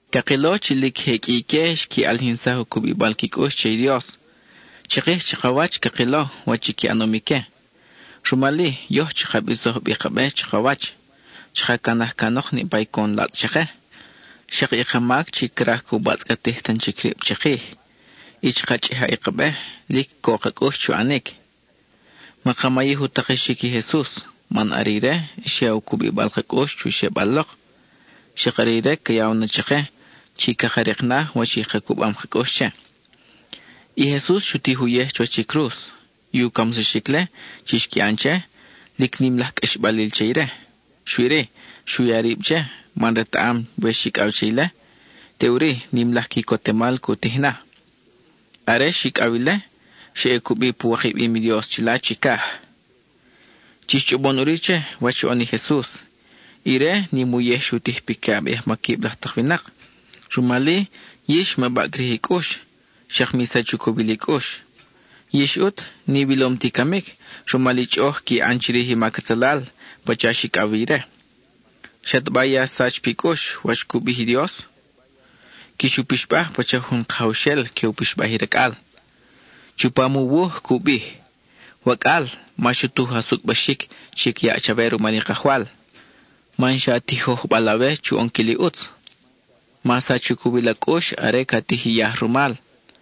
Cakilo chi lic je qʼui ique xqui ʼalijinsaj u cubibal qui cʼux che i Dios. Chikij chakawach cakilo wach qui ʼanom ique. Rumal-i yoj chaka bisoj bi ka be chakawach. Chaka canaj canok niʼpa i coʼon latzʼ chake, xak i ka mac chi craj cu batzʼcatij tan chic rib chikij, y chaka chʼija i ka be lic co ka cʼux chu ʼanic. Maka mayij u takexic i Jesus, man are ire xyaw u cubibal ka cʼux chu xebal lok, xak are ire ca yaw na chake chi caka rik na wach i ka cubam ka cʼux che. I Jesus xu tij uyej chuwach i cruz. I u camsaxic-le chi xqui ʼan che, lic nim laj qʼuixbal che ire, xui-ri, xu ya rib che, man retaʼam we xicʼaw che ile, teʼuri nim laj quicotemal cu tij na. Are xicʼaw ile, xa ʼe cubi pu wikabim i Dios chila chicaj. Chix chʼobon ʼuri che wach xoʼon i Jesus. Ire, nim i uyej xu tij piquiʼab i ajmaquib laj tak winak. Rumal-i, yix ma baʼcrij i cʼux, xak mi sach u cowil i cʼux. Yix ʼut n-iwilom ti i camic rumal i chʼoʼoj qui ʼan chirij i mac atzalal, pacha xicʼaw wi ire. ¿Xataba ya xsach pi cʼux wach cu bij i Dios? Quix u pixbaj pacha jun kajawxel que u pixbaj i racʼal. Chupam u wuj cu bij: Wacʼal, ma xutuj a sucʼbaxic chi ca yaʼ chawe rumal i Kajwal, man xa tijojbal awe chu ʼonquil i ʼutz. Ma sach u cowil a cʼux are ca tij yaj rumal.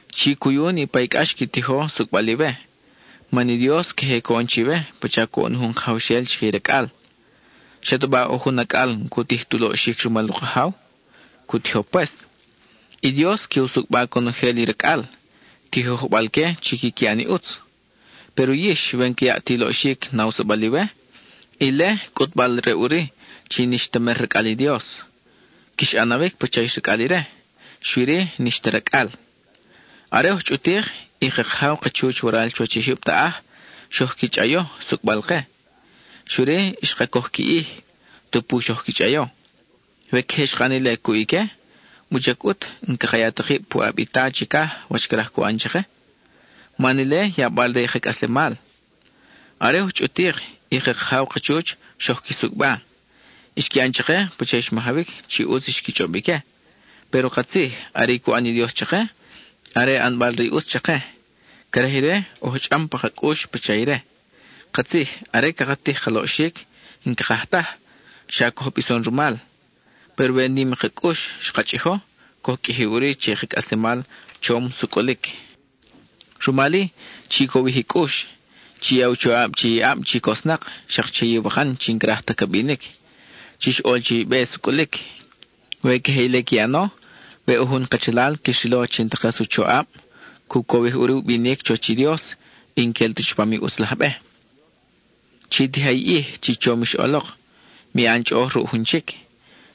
Chi cuyu niʼpa i cʼax qui tijo sucʼbal iwe, man i Dios queje coʼon chiwe pacha coʼon jun kajawxel chique i racʼal. ¿Xataba ʼo jun acʼal n-cu tij tu loʼxic rumal u kajaw? Cu tijo pues. I Dios que u sucʼba conojel i racʼal, tijojbal-que chi quiqui ʼan i ʼutz. Péro yix, we n-ca yaʼ ta i loʼxic nawsabal iwe, ile cʼutbal-re ʼuri chi n-ix ta mer racʼal i Dios; quix ʼanawic pacha ix racʼal ire, xui-ri, n-ix ta racʼal. Are oj chʼutik, i ka kajaw ka chuch waral chuwach i jyub taʼaj xoj qui chʼayo sucʼbal-ke; xui-ri, xka coj qui ʼij, tupu xoj qui chʼayo. We queje xka ʼan ile cuʼ ique, ¿wuchac ʼut n-caka ya ta kib puʼab i Ta chicaj wach craj cu ʼan chake? Man ile yabal re i ka cʼaslemal. Are oj chʼutik, i ka kajaw ka chuch xoj qui sucʼba. Xqui ʼan chake pacha i xmajawic chi ʼutz xqui chʼob ique. Péro katzij, are i cu ʼan i Dios chake, are ʼanbal re i ʼutz chake. Craj ire, oj chʼam pa ka cʼux pacha ire. Katzij, are caka tij ka loʼxic, n-cakaj taj, xa coj bison rumal. Péro we nim ka cʼux xka chʼijo, coj qʼuiji ʼuri che i ka cʼaslemal chom sucʼulic. Rumal-i, chi cowij i cʼux. Chi ya i choʼab che i ʼab chi cosnak, xak che iwakan chi n-craj ta ca binic. Chix ʼol che i be sucʼulic. We queje ile qui ʼano, we ʼo jun kachalal quix rilo chi n-ta kas u choʼab, cu cowij ʼuri u binic chuwach i Dios y n-quel ta chupam i ʼutz laj be. Chi tija i ʼij chi chom ix ʼolok; mi ʼan chʼoʼoj ruʼ jun chic.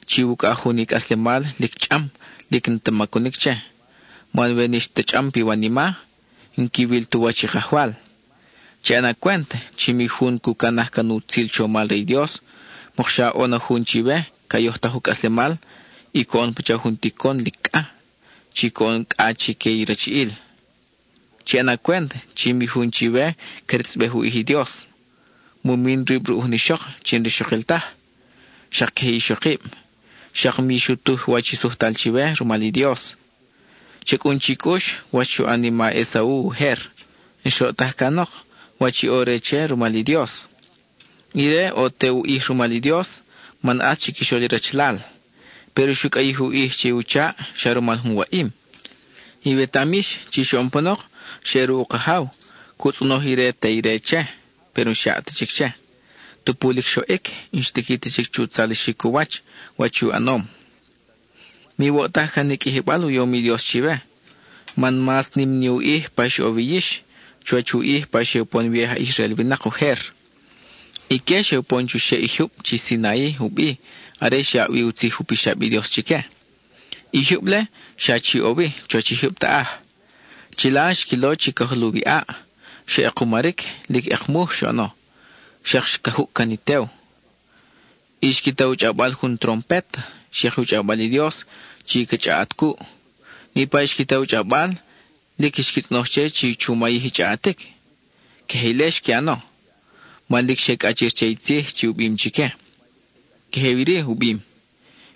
Chiwucʼaj jun i cʼaslemal lic chʼam, lic n-ta macunic che, man we n-ix ta chʼam piwanima, n-quiwil tu wach i Kajwal. Chi ʼana cwent chi mi jun cu canaj can i utzil chomal re i Dios, mokxa ʼo na jun chiwe ca yojtaj u cʼaslemal y coʼon pacha jun ticon lic cʼa, chi coʼon cʼa chique i rachiʼil. Chi ʼana cwent chi mi jun chiwe cretzʼbej u ʼij i Dios; mu min rib ruʼ jun ixok chi n-rixokil taj; xak queje i ixokib; xak mi xutuj wach i sujtal chiwe rumal i Dios. Cha cʼun chi cʼux, wach xu ʼan i ma Esau ujer; xroʼtaj can wach i ʼo re che rumal i Dios. Ire ʼo te u ʼij rumal i Dios, man ʼatz chiquixol i rachalal. Péro xu cʼayij u ʼij che u chaʼ xa rumal jun waʼim. Iwetaʼam yix chi xoʼon panok xa ʼe ruʼ u kajaw, cu tzʼonoj i re te ire che, péro n-xyaʼ ta chic che. Tupu lic xoʼic, n-xtiqui ta chic chu tzalixic u wach, wach i u ʼanom. Miwoʼtaj can i qʼuijibal u yom i Dios chiwe. Man mas nim ni u ʼij pa ix ʼo wi yix, chuwach u ʼij pa xe upon wi i aj Israel winak ujer. Ique xe upon chuxeʼ i jyub chi Sinai u bi are xyaʼ wi u tzij u pixab i Dios chique. I jyub-le, xa chi ʼo wi, chuwach i jyub taʼaj. Chila xquilo chi ca juluw i ʼaʼ, xa ʼekumaric, lic ʼekmuj xoʼono; xak ca jucʼcan i tew. Y xqui ta u chʼawbal jun trompet, xak i u chʼawbal i Dios chi ca chʼaʼat cuʼ. Niʼpa i xqui ta u chʼawbal, lic xqui tzʼonoj che chi chu mayij i chʼaʼatic. Queje ile xqui ʼano, man lic xe cʼachir che i tzij chi u bim chique: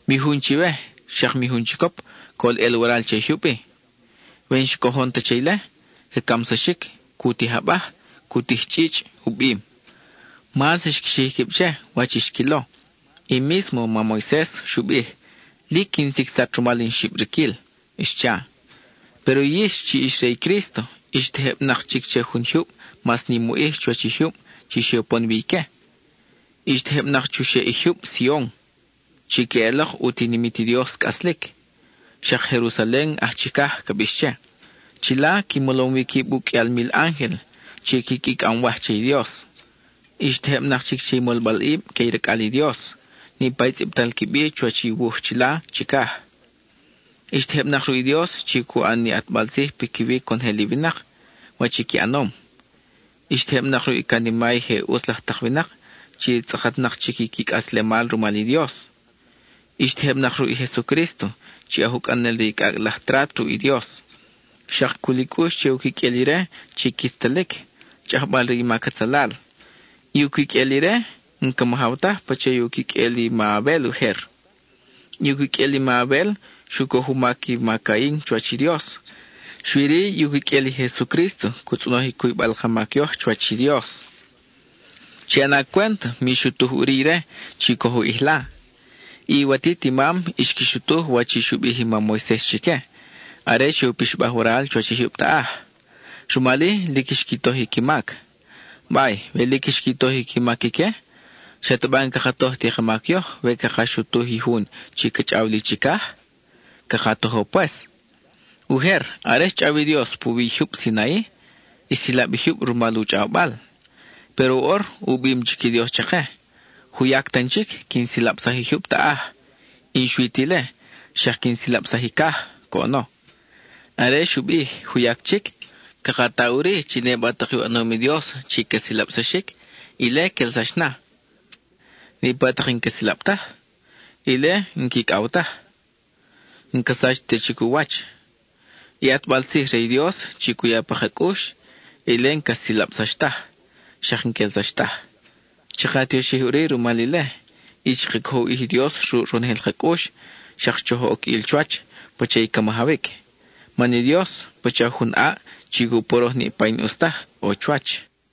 “Mi jun chiwe, xak mi jun chicop, col ʼel waral che i jyub-i. We n-xcojon ta che ile, ca camsaxic; cu tij abaj, cu tij chʼichʼ,” u bim. Mas xqui xij quib che, wach i xquilo. I mísmo mam Moises xu bij: “Lic quin sicsat rumal in xibriquil,” xcha. Péro yix chi ix re i Crísto ix tejebnak chic che jun jyub mas nim u ʼij chuwach i jyub chi xe upon wi ique. Ix tejebnak chuxeʼ i jyub Sion, chi queʼelok u tinimit i Dios cʼaslic, xak Jerusalen aj chicaj ca bix che. Chila qui molom wi quib u qʼuial mil ángel chi quiqui cʼamwaj che i Dios. Ix tejebnak chic che i molbalʼib que i racʼal i Dios, niʼpa i tzʼibtal qui bi chuwach i wuj chila chicaj. Ix tejebnak ruʼ i Dios chi cu ʼan ni ʼatbal tzij piquiwi conojel i winak, wach i qui ʼanom. Ix tejebnak ruʼ i canima i je ʼutz laj tak winak chi tzʼakatnak chic i qui cʼaslemal rumal i Dios. Ix tejebnak ruʼ i Jesucrísto chi aj ucʼanel re i cʼacʼ laj trat ruʼ i Dios; xak cul i cʼux che u quiqʼuel ire chi quitztalic, chʼajbal re i mac atzalal. I u quiqʼuel ire n-ca majaw taj pacha u quiqʼuel i ma Abel ujer. (I u quiqʼuel i ma Abel xu coj u mac i ma Cain chuwach i Dios, xui-ri, i u quiqʼuel i Jesucrísto cu tzʼonoj i cuybal ka i mac yoj chuwach i Dios.) Chi ʼana cwent, mi xutuj ʼuri ire chi coj u ʼijla. I iwatit i mam xqui xutuj wach i xu bij i mam Moises chique, are xe u pixbaj waral chuwach i jyub taʼaj; rumal-i lic xqui toj i qui mac. Bay, we lic xqui toj i qui mac ique, ¿xataba n-caka toj ti ka mac yoj we caka xutuj i jun chi ca chʼaw li chicaj? Caka tojo pues. Ujer, are xchʼaw i Dios puwi i jyub Sinai, xsilab i jyub rumal u chʼawbal. Péro woʼor, u bim chic i Dios chake: “Juyac tan chic quin silabsaj i jyub taʼaj, y n-xui ti ile, xak quin silabsaj i caj”, coʼono. Are xu bij “juyac chic”, caka ta ʼuri chi niʼpa tak i u ʼanom i Dios chi ca silabsaxic, ile quelsax na; niʼpa tak i n-ca silab taj, ile n-quicʼaw taj, n-ca sach ta chic u wach. I ʼatbal tzij re i Dios chi cu ya pa ka cʼux, ile n-ca silabsax taj, xak n-quelsax taj. Chaka tioxij ʼuri rumal ile, y chaka cojo u ʼij i Dios ruʼ ronojel ka cʼux, xak choj oc ʼil chuwach pacha i ca majawic. Man i Dios, pacha jun ʼaʼ chi cu poroj niʼpa i n-ʼus taj ʼo chuwach.